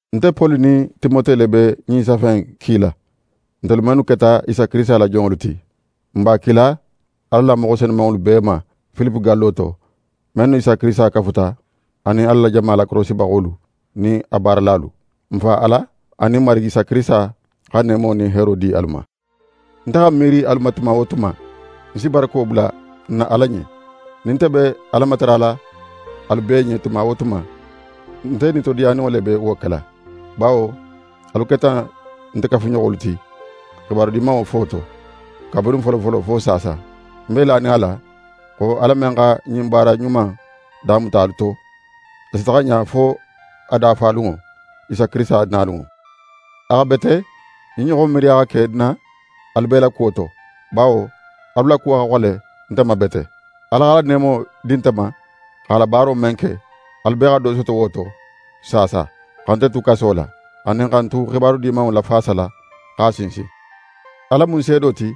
Nte Poli nin Timote le be ɲin safe in kila, ntelu mennu keta Isa Kirisita la jonŋolu ti. N b'a kila Ala la moxo senumanŋolu bee ma Filipe gallo to, mennu nin Isa Kirisita kafuta, anin Ala la jama lakorosibaxolu nin a baaralalu. N Fa Ala anin Marigi Isa Kirisita xa neemo nin heero di alu ma. Nte xa ń miiri alu ma tuma wo tuma, ń si barako bula ń na Ala ɲen. Nin nte be Ala matarala alu bee ɲen tuma wo tuma, nte nitodiyaninŋo le be wo kela, bawo alu keta nte kafuɲoxolu ti xibaru Dimanŋo fo to, kabirin folofolo fo saasa. Ń be lanin a la xo Ala men xa ɲin baara ɲuma in damuta alu to, a si taxa ɲa fo a dafalunŋo, Isa Kirisita nalunŋo. A xa bete ɲin ɲoxon miiriya xa ke ń na alu bee la kuwo to, bawo alu la kuwo xa xole nte ma bete. Ala x'a la neemo di nte ma x'a la baaro men ke, alu bee xa do soto wo to, saasa xa nte tu kaso la, anin xa ń tu Xibaru Dimanŋo lafaasala, x'a sinsin. Ala mu ń seedo ti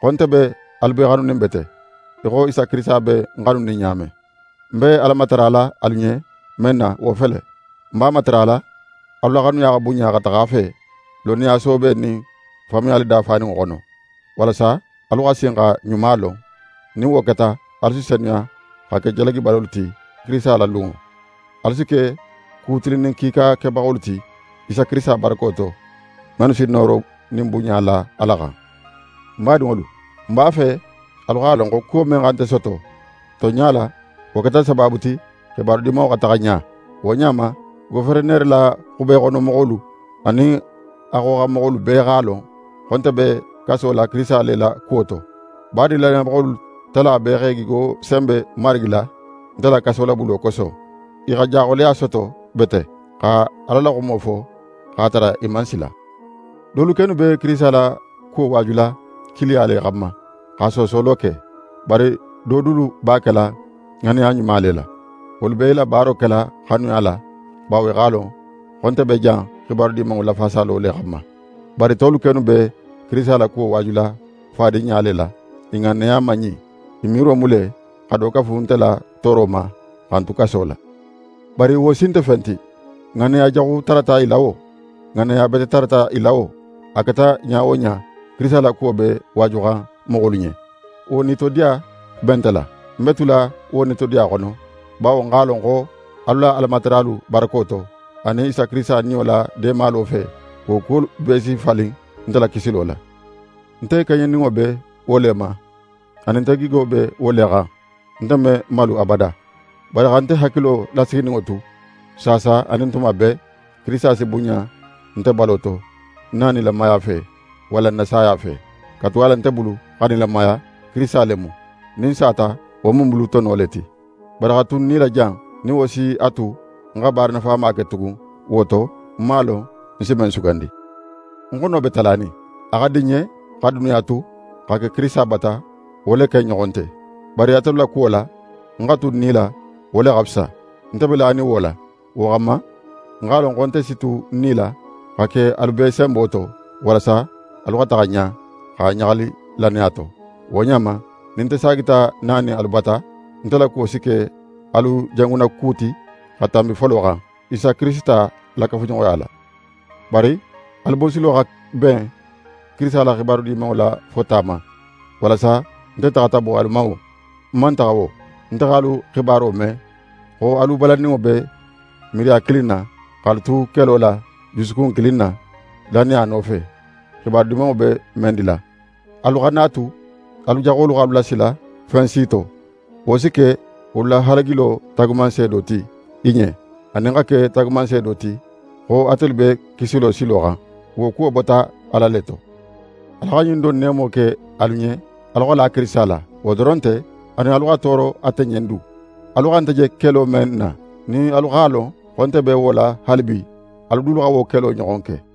xo nte be alu bee xanunin bete, í xo Isa Kirisita be ń xanunin ɲa men. Ń be Ala matarala alu ɲen men na, wo fele: Ń b'a matarala, alu la xanuya xa bunɲa xa taxa a fe, lonniya soobe nin faamuyali dafaninŋo xono, walasa alu xa sin xa ɲuma lon. Nin wo keta, alu si senuya, xa ke jalagibalolu ti Kirisita la lunŋo. Alu si ke ku tilinnin kiika kebaxolu ti, Isa Kirisita barako to, mennu si nooro nin bunɲa la Ala xan. Ń badinŋolu, ń b'a fe alu x'a lon xo kuwo men xa nte soto, tonɲa la, wo keta sabaabu ti xibaru Dimanŋo xa taxa ɲa. Wo ɲa ma, goferenere la xube xono moxolu, anin a xoxanmoxolu bee x'a lon xo nte be kaso la Kirisita le la kuwo to. Badin lannayabaxolu tala bee x'e gigo senbe Marigi la, nte la kasolabulo koso. I xa jaxoleya soto bete, xa Ala la xumo fo x'a tara i man sila. Dolu kennu be Kirisita la kuwo waajula kiiliya le xanma, xa soosolo ke. Bari do dulu b'a kela ŋanneya ɲuma le la. Wolu be i la baaro kela xanuya la, bawo i x'a lon xo nte be jan Xibaru Dimanŋo lafaasalo le xanma. Bari tolu kennu be Kirisita la kuwo waajula fadinɲa le la. I ŋanneya man ɲin; i miiro mu le xa do kafu nte la tooro ma xa ń tu kaso la. Bari wo si nte fen ti. Ŋanneya jaxu tarata i la wo, ŋanneya bete tarata i la wo, a keta ɲa wo ɲa, Kirisita la kuwo be waajuxan moxolu ɲen, wo nitodiya be nte la. Ń be tula wo nitodiya xono, bawo ń x'a lon xo alu la Alamataralu barako to, anin Isa Kirisita Niyo la deemalo fe, wo kuwolu bee si falin nte la kisilo la. Nte keɲeninŋo be wo le ma, anin nte gigo be wo le xan, nte me malu abada. Bari xa nte hakilo lasigininŋo tu, saasa, anin tuma bee, Kirisita si bunɲa nte balo to, ń na nilamaya fe, walla ń na saya fe. Katugala nte bulu, xa nilamaya, Kirisita le mu. Nin ń sata, wo mu ń bulu tono le ti. Bari xa tu ń nila jan, nin wo si a tu ń xa baara nafama ke tugun, wo to, ń man a lon ń si men sugandi. Ń xono be talanin: A xa di ń ɲen xa duniya tu, xa ke Kirisita bata; wo le ken ɲoxon nte. Bari atelu la kuwo la, ń xa tu ń nila, wo le xa fisa. Nte be lanin wo la. Wo xanma, ń x'a lon xo nte si tu ń nila, xa ke alu bee senbo to, walasa alu xa taxa ɲa, xa ɲaxali lannaya to. Wo ɲa ma, nin nte saagita nanin alu bata, nte la kuwo si ke alu jangunnaku ti xa tanbi folo xan, Isa Kirisita la kafuɲoxoya la. Bari alu bosilo xa ben Kirisita la Xibaru Dimanŋo la fota ma; walasa nte taxata bo alu ma wo, ń man taxa wo, nte x'alu xibaro me xo alu balanninŋo be miiriya kilin na, x'alu tu kelo la jusukun kilin na, lannaya nofe, Xibaru Dimanŋo be men dila. Alu xana a tu alu jaxolu x'alu lasila fen si to. Wo si ke wolu la halagilo taagumanseedo ti i ɲen, anin xa ke taagumanseedo ti xo atelu be kisilo silo xan. Wo kuwo bota Ala le to. Ala xa ɲin don neemo ke alu ɲen alu xa la Kirisita la; wo doron nte, anin alu xa tooro ate ɲen du. Alu xa nte je kelo men na, nin alu x'a lon xo nte be wo la haalibi, alu dulu xa wo kelo ɲoxon ke.